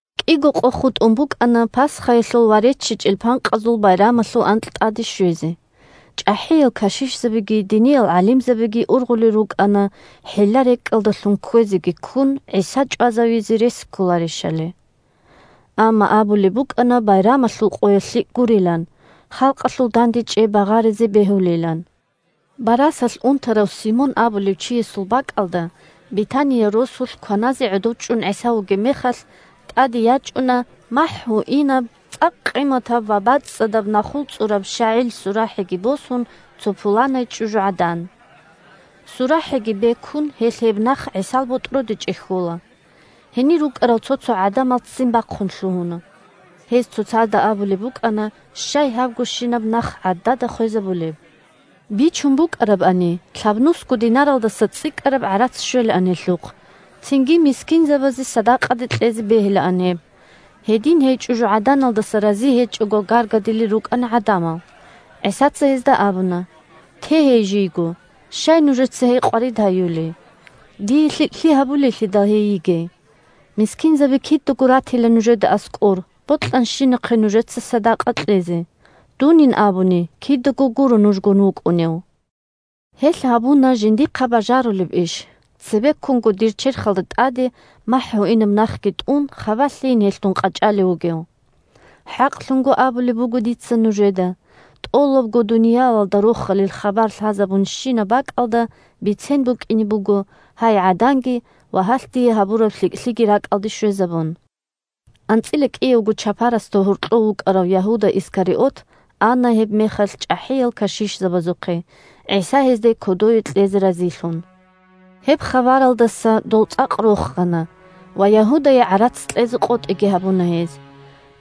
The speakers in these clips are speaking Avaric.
КӀиго къо хутӀун букӀана Пасхаялъул ва РеччичӀел Панкъазул Байрамалъул анкь тӀаде щвезе. ЧӀахӀиял кашишзабиги диниял гӀалимзабиги ургъулел рукӀана хӀилла-рекӀкӀалдалъун кквезеги ккун ГӀиса чӀвазавизе рес кколарищали. Амма абулеб букӀана байрамалъул къоялъ лъикӀ гурилан, халкъалъул дандечӀей багъаризе бегьулилан. Барасалъ унтарав Симон абулев чиясул бакӀалда Бетания росулъ кваназе гӀодов чӀун ГӀиса вугеб мехалъ, тӀаде ячӀуна махӀ гьуинаб цӀакъ къиматаб ва бацӀцӀадаб нахул цӀураб щагӀил сурахӀиги босун, цо пуланай чӀужугӀадан. СурахӀиги бекун, гьелъ гьеб нах ГӀисал ботӀроде чӀехьола. Гьенир рукӀарал цо-цо гӀадамал ццин бахъун лъугьуна. Гьез цоцазда абулеб букӀана: – Щай гьабгощинаб нах гӀадада хвезабулеб? Бичун букӀарабани, лъабнусго динаралдаса цӀикӀкӀараб гӀарац щвелаан гьелъухъ, цинги мискинзабазе садакъаде кьезе бегьилаан гьеб. Гьедин гьей чӀужугӀаданалдаса рази гьечӀого гаргадилел рукӀана гӀадамал. ГӀисаца гьезда абуна: – Те гьей жийго! Щай нужеца гьей къварид гьаюлей? Дие лъикӀлъи гьабулейлъидал гьей йигей. Мискинзаби кидаго ратила нужеда аскӀор, бокьанщинахъе нужеца садакъа кьезе. Дунин абуни кидаго гуро нужгун вукӀунев. Гьелъ гьабуна жиндихъа бажарулеб иш; цебеккунго дир черхалда тӀаде махӀ гьуинаб нахги тӀун, хабалъейин гьелъ дун къачӀалев вугев. ХӀакълъун абулеб буго дица нужеда: тӀолабго дуниялалда Рохалил хабар лъазабунщинаб бакӀалда бицен букӀине буго гьай гӀаданги ва гьалъ дие гьабураб лъикӀлъиги ракӀалде щвезабун. АнцӀила кӀиявго чапарасда гьоркьов вукӀарав Ягьуда Искариот ана гьебмехалъ чӀахӀиял кашишзабазухъе, ГӀиса гьезда кодове кьезе разилъун. Гьеб хабаралдаса дол цӀакъ рохана, ва Ягьудае гӀарац кьезе къотӀиги гьабуна гьез.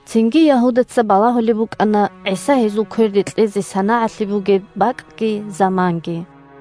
Цинги Ягьудаца балагьулеб букӀана ГӀиса гьезул кверде кьезе санагӀалъи бугеб бакӀги заманги.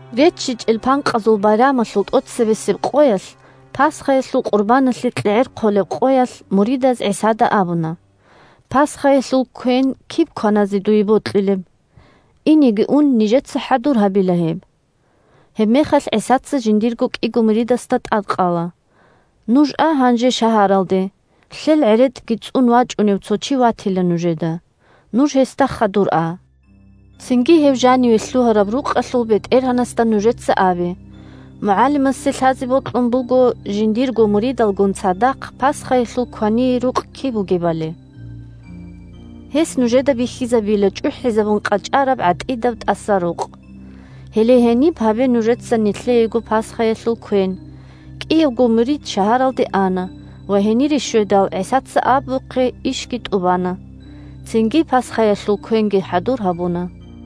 РеччичӀел Панкъазул Байрамалъул тӀоцебесеб къоялъ, Пасхаялъул къурбаналъе кьегӀер хъолеб къоялъ, муридаз ГӀисада абуна: – Пасхаялъул квен киб кваназе дуе бокьилеб? Инеги ун, нижеца хӀадур гьабила гьеб. Гьебмехалъ ГӀисаца жиндирго кӀиго муридасда тӀадкъала: – Нуж а гьанже шагьаралде. Лъел гӀеретӀги цӀун вачӀунев цо чи ватила нужеда. Нуж гьесда хадур а. Цинги гьев жаниве лъугьараб рукъалъул бетӀергьанасда нужеца абе: «МугӀалимасе лъазе бокьун буго жиндирго муридалгун цадахъ Пасхаялъул квание рукъ киб бугебали». Гьес нужеда бихьизабила чӀухӀизабун къачӀараб гӀатӀидаб тӀасарукъ. Гьеле гьениб гьабе нужеца нилъеего Пасхаялъул квен. КӀиявго мурид шагьаралде ана ва гьенире щведал, ГӀисаца абухъе, ишги тӀубана. Цинги Пасхаялъул квенги хӀадур гьабуна.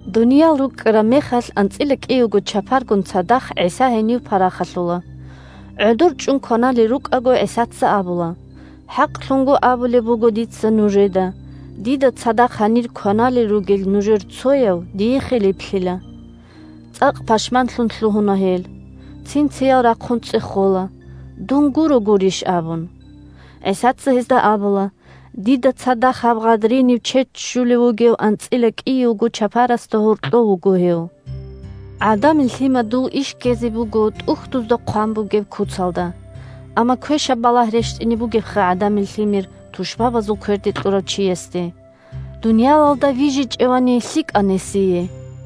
Дуниял рукӀкӀараб мехалъ анцӀила кӀиявго чапаргун цадахъ ГӀиса гьенив парахалъула. ГӀодор чӀун кваналел рукӀаго, ГӀисаца абула: – ХӀакълъун абулеб буго дица нужеда: дида цадахъ гьанир кваналел ругел нужер цояв дие хилиплъила. ЦӀакъ пашманлъун лъугьуна гьел. Цин-циял рахъун цӀехола: – Дун гуро гурищ? – абун. ГӀисаца гьезда абула: – Дида цадахъ гьаб гъадриниб чед ччулев вугев анцӀила кӀиявго чапарасда гьоркьов вуго гьев. ГӀадамил Лъимадул иш ккезе буго ТӀухьдузда хъван бугеб куцалда. Амма квешаб балагь рещтӀине бугебха ГӀадамил Лъимер тушбабазул кверде кьурав чиясде. Дуниялалда вижичӀевани лъикӀан гьесие.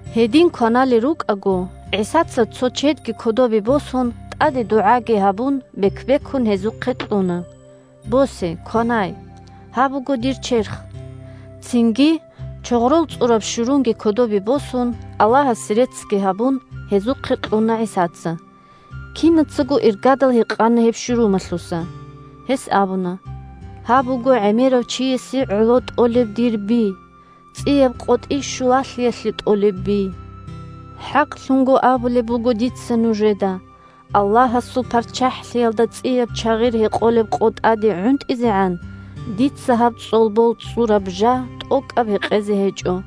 Гьедин кваналел рукӀаго, ГӀисаца, цо чедги кодобе босун, тӀаде дугӀаги гьабун, бек-бекун гьезухъе кьуна: – Босе, кванай. Гьаб буго дир черх! Цинги, чогърол цӀураб щурунги кодобе босун, Аллагьасе реццги гьабун, гьезухъе кьуна ГӀисаца. Кинацаго иргадал гьекъана гьеб щурумалъуса. Гьес абуна: – Гьаб буго гӀемерав чиясе гӀоло тӀолеб дир би – ЦӀияб КъотӀи щулалъиялъе тӀолеб би. ХӀакълъун абулеб буго дица нужеда: Аллагьасул ПарччахӀлъиялда цӀияб чагъир гьекъолеб къо тӀаде гӀунтӀизегӀан дица гьаб цӀолбол цӀцӀураб жа тӀокӀаб гьекъезе гьечӀо.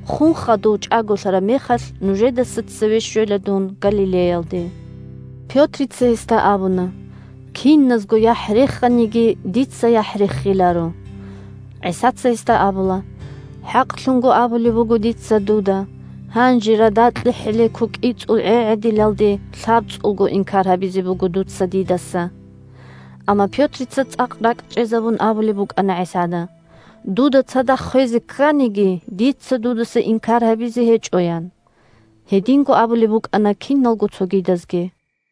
Хун хадув чӀаголъараб мехалъ нужедаса цеве щвела дун Галилеялде. Пётрица гьесда абуна: – Киназго яхӀ реханиги, дица яхӀ рехиларо. ГӀисаца гьесда абула: – ХӀакълъун абулеб буго дица дуда: гьанже радакье хӀелеко кӀицӀул гӀегӀедилалде лъабцӀулго инкар гьабизе буго дуца дидаса. Амма Пётрица цӀакъ ракӀчӀезабун абулеб букӀана ГӀисада: – Дуда цадахъ хвезе кканиги, дица дудаса инкар гьабизе гьечӀо, – ян. Гьединго абулеб букӀана киналго цогидазги.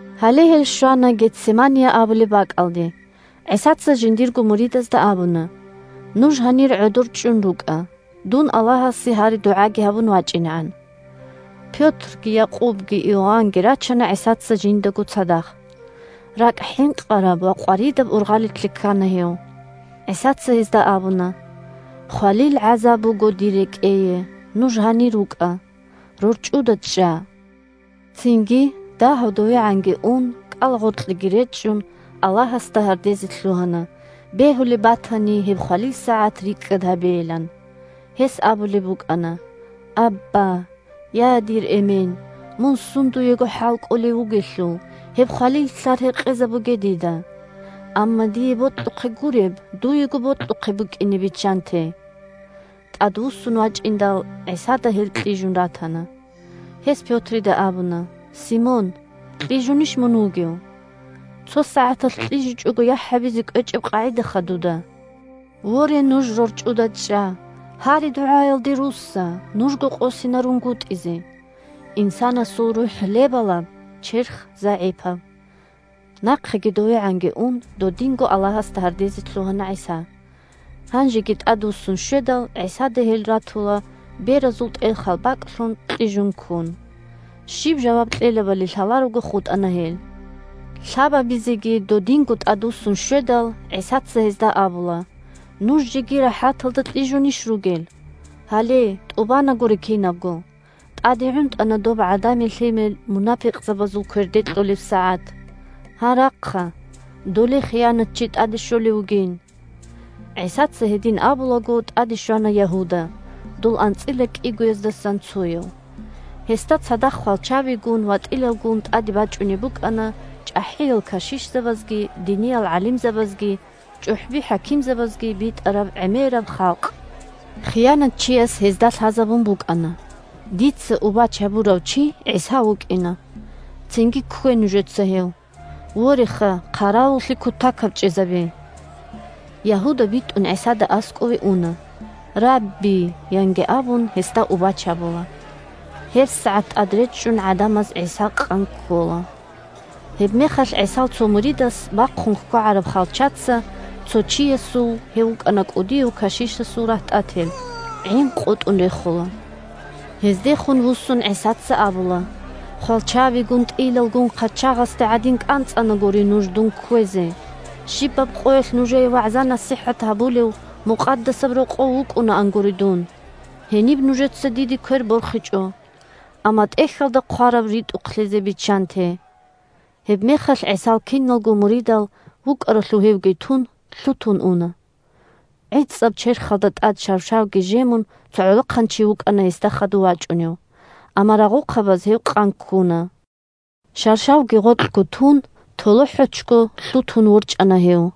Гьале гьел щвана Гетсемания абулеб бакӀалде. ГӀисаца жиндирго муридазда абуна: – Нуж гьанир гӀодор чӀун рукӀа, дун Аллагьасе гьари-дугӀа гьабун вачӀинегӀан. Пётрги, Якъубги, Иоаннги рачана ГӀисаца жиндаго цадахъ. РакӀ хӀинкъараб ва къваридаб ургъалилъе ккана гьев. ГӀисаца гьезда абуна: – Хвалил гӀазаб буго дир рекӀее. Нуж гьанир рукӀа! РорчӀуда чӀа! Цинги, дагьав довегӀанги ун, кӀалагъоркьеги речӀчӀун, Аллагьасда гьардезе лъугьана, бегьулеб батани гьеб хвалил сагӀат рикӀкӀад гьабейилан. Гьес абулеб букӀана: – Абба! Абба! – дада, эмен. Я дир Эмен! Мун сундуего хӀалкӀолев вугелъул, гьеб хвалил лълъар гьекъезабуге дида. Амма дие бокьухъе гуреб, дуего бокьухъе букӀине биччанте! ТӀадвуссун вачӀиндал, ГӀисада гьел кьижун ратана. Гьес Пётрида абуна: – Симон! Кьижунищ мун вугев? Цо сагӀаталъ кьижичӀого яхӀ гьабизе кӀвечӀеб къагӀидаха дуда? Воре, нуж рорчӀуда чӀа! Гьари-дугӀаялде русса, нужго къосинарунгутӀизе. Инсанасул рухӀ – лебалаб, черх – загӀипаб. Нахъеги довегӀанги ун, додинго Аллагьасда гьардезе лъугьана ГӀиса. Гьанжеги тӀадвуссун щведал, ГӀисада гьел ратула, беразул тӀелхал бакӀлъун, кьижун ккун. Щиб жаваб кьелебали лъаларого хутӀана гьел. Лъабабизеги додинго тӀадвуссун щведал, ГӀисаца гьезда абула: – Нуж жеги рахӀаталда кьижунищ ругел? Гьале, тӀубанагури кинабго! ТӀаде гӀунтӀана доб ГӀадамил Лъимер мунапикъзабазул кверде кьолеб сагӀат. Гьа, рахъа! Доле хиянатчи тӀаде щолев вугин! ГӀисаца гьедин абулаго, тӀаде щвана Ягьуда, дол анцӀила кӀигояздасан цояв. Гьесда цадахъ хвалчабигун ва тӀилалгун тӀаде бачӀунеб букӀана чӀахӀиял кашишзабазги, диниял гӀалимзабазги, чӀухӀби-хӀакимзабазги битӀараб гӀемераб халкъ. Хиянатчияс гьезда лъазабун букӀана: «Дица убач гьабурав чи ГӀиса вукӀина. Цинги ккве нужеца гьев. Вореха, хъаравуллъи кутакаб чӀезабе!» Ягьуда битӀун ГӀисада аскӀове уна, «Рабби!» – янги абун, гьесда убач гьабула. ГьебсагӀат тӀад речӀчӀун гӀадамаз ГӀиса къан ккола. Гьебмехалъ ГӀисал цо муридас бахъун хьвагӀараб хвалчаца цо чиясул (гьев вукӀана кӀудияв кашишасул рагьтӀател) гӀин къотӀун рехула. Гьездехун вуссун ГӀисаца абула: – Хвалчабигун, тӀилалгун хъачагъасде гӀадин кӀанцӀанагури нуж дун кквезе. Щибаб къоялъ нужее вагӀза-насихӀат гьабулев Мукъадасаб Рокъов вукӀунаангури дун. Гьениб нужеца диде квер борхичӀо. Амма ТӀехьалда хъвараб ритӀухълъизе биччанте! Гьебмехалъ ГӀисал киналго муридал, вукӀаралъув гьевги тун, лъутун уна. ГӀицӀаб черхалда тӀад шаршавги жемун, цо гӀолохъанчи вукӀана гьесда хадув вачӀунев. Амма рагъухъабаз гьев къан ккуна. Шаршавги гъоркьго тун, толохӀочго лъутун ворчӀана гьев.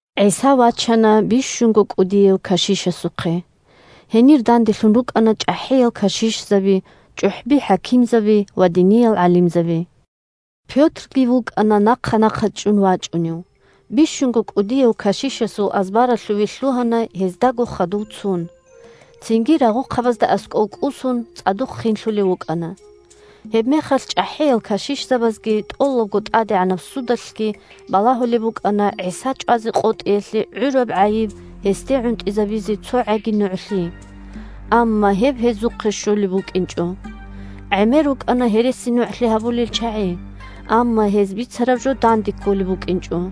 ГӀиса вачана бищунго кӀудияв кашишасухъе. Гьенир данделъун рукӀана чӀахӀиял кашишзаби, чӀухӀби-хӀакимзаби ва диниял гӀалимзаби. Пётрги вукӀана нахъа-нахъа чӀун вачӀунев. Бищунго кӀудияв кашишасул азбаралъувеги лъугьана гьездаго хадув цун. Цинги рагъухъабазда аскӀов кӀусун, цӀадухъ хинлъулев вукӀана. Гьебмехалъ чӀахӀиял кашишзабазги тӀолабго тӀадегӀанаб судалъги балагьулеб букӀана ГӀиса чӀвазе къотӀиялъе гӀураб гӀайиб гьесде гӀунтӀизабизе цогӀаги нугӀлъи. Амма гьеб гьезухъе щолеб букӀинчӀо. ГӀемер рукӀана гьересинугӀлъи гьабулел чагӀи, амма гьез бицараб жо данде кколеб букӀинчӀо.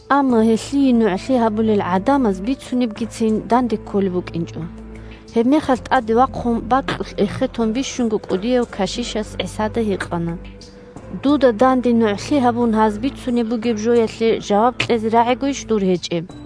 Амма гьелъие нугӀлъи гьабулел гӀадамаз бицунебгицин данде кколеб букӀинчӀо. Гьебмехалъ тӀаде вахъун бакьулъ эхетун бищунго кӀудияв кашишас ГӀисада гьикъана: – Дуда данде нугӀлъи гьабун гьаз бицунеб бугеб жоялъе жаваб кьезе рагӀигойищ дур гьечӀеб?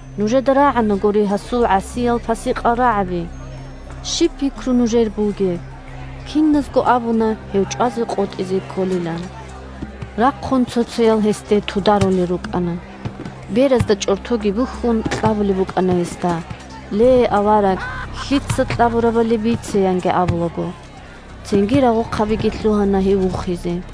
Нужеда рагӀанагури гьасул гӀасиял-пасикъал рагӀаби. Щиб пикру нужер бугеб? Киназго абуна гьев чӀвазе къотӀизе кколилан. Рахъун цо-цоял гьесде тударулел рукӀана. Беразда чӀортоги бухьун, кьабулеб букӀана гьесда: – Ле, авараг, лъица кьабурабали бице! – янги абулаго. Цинги рагъухъабиги лъугьана гьев вухизе.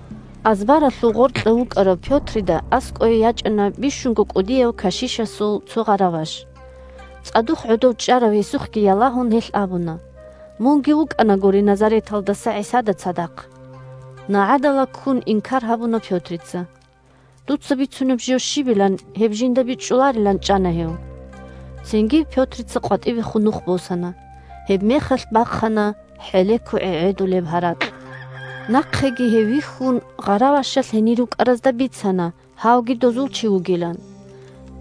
Азбаралъув гъоркьа вукӀарав Пётрида аскӀое ячӀана бищунго кӀудияв кашишасул цо гъараваш. ЦӀадухъ гӀодов чӀарав гьесухъги ялагьун, гьелъ абуна: – Мунги вукӀанагури Назареталдаса ГӀисада цадахъ. НагӀадала ккун инкар гьабуна Пётрица. Дуца бицунеб жо щибилан, гьеб жинда бичӀчӀуларилан чӀана гьев. Цинги Пётрица къватӀибехун нух босана. Гьебмехалъ бахъана хӀелеко гӀегӀедулеб гьаракь. Нахъеги гьев вихьун, гъаравашалъ гьенир рукӀаразда бицана гьавги дозул чи вугилан.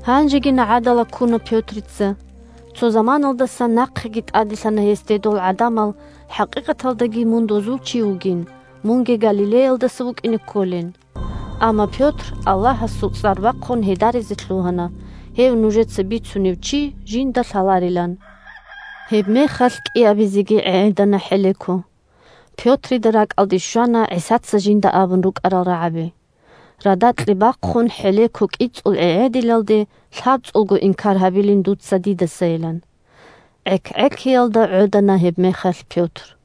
Гьанжеги нагӀадала ккуна Пётрица. Цо заманаялдасан нахъеги тӀаделъана гьесде дол гӀадамал хӀакъикъаталдаги мун дозул чи вугин, мунги Галилеялдаса вукӀине кколин. Амма Пётр Аллагьасул цӀар бахъун гьедаризе лъугьана гьев нужеца бицунев чи жинда лъаларилан. Гьебмехалъ кӀиабизеги гӀегӀедана хӀелеко. Пётрида ракӀалде щвана ГӀисаца жинда абун рукӀарал рагӀаби: радакье бахъун хӀелеко кӀицӀул гӀегӀедилалде лъабцӀулго инкар гьабилин дуца дидасайилан. ГӀек-гӀекиялда гӀодана гьебмехалъ Пётр.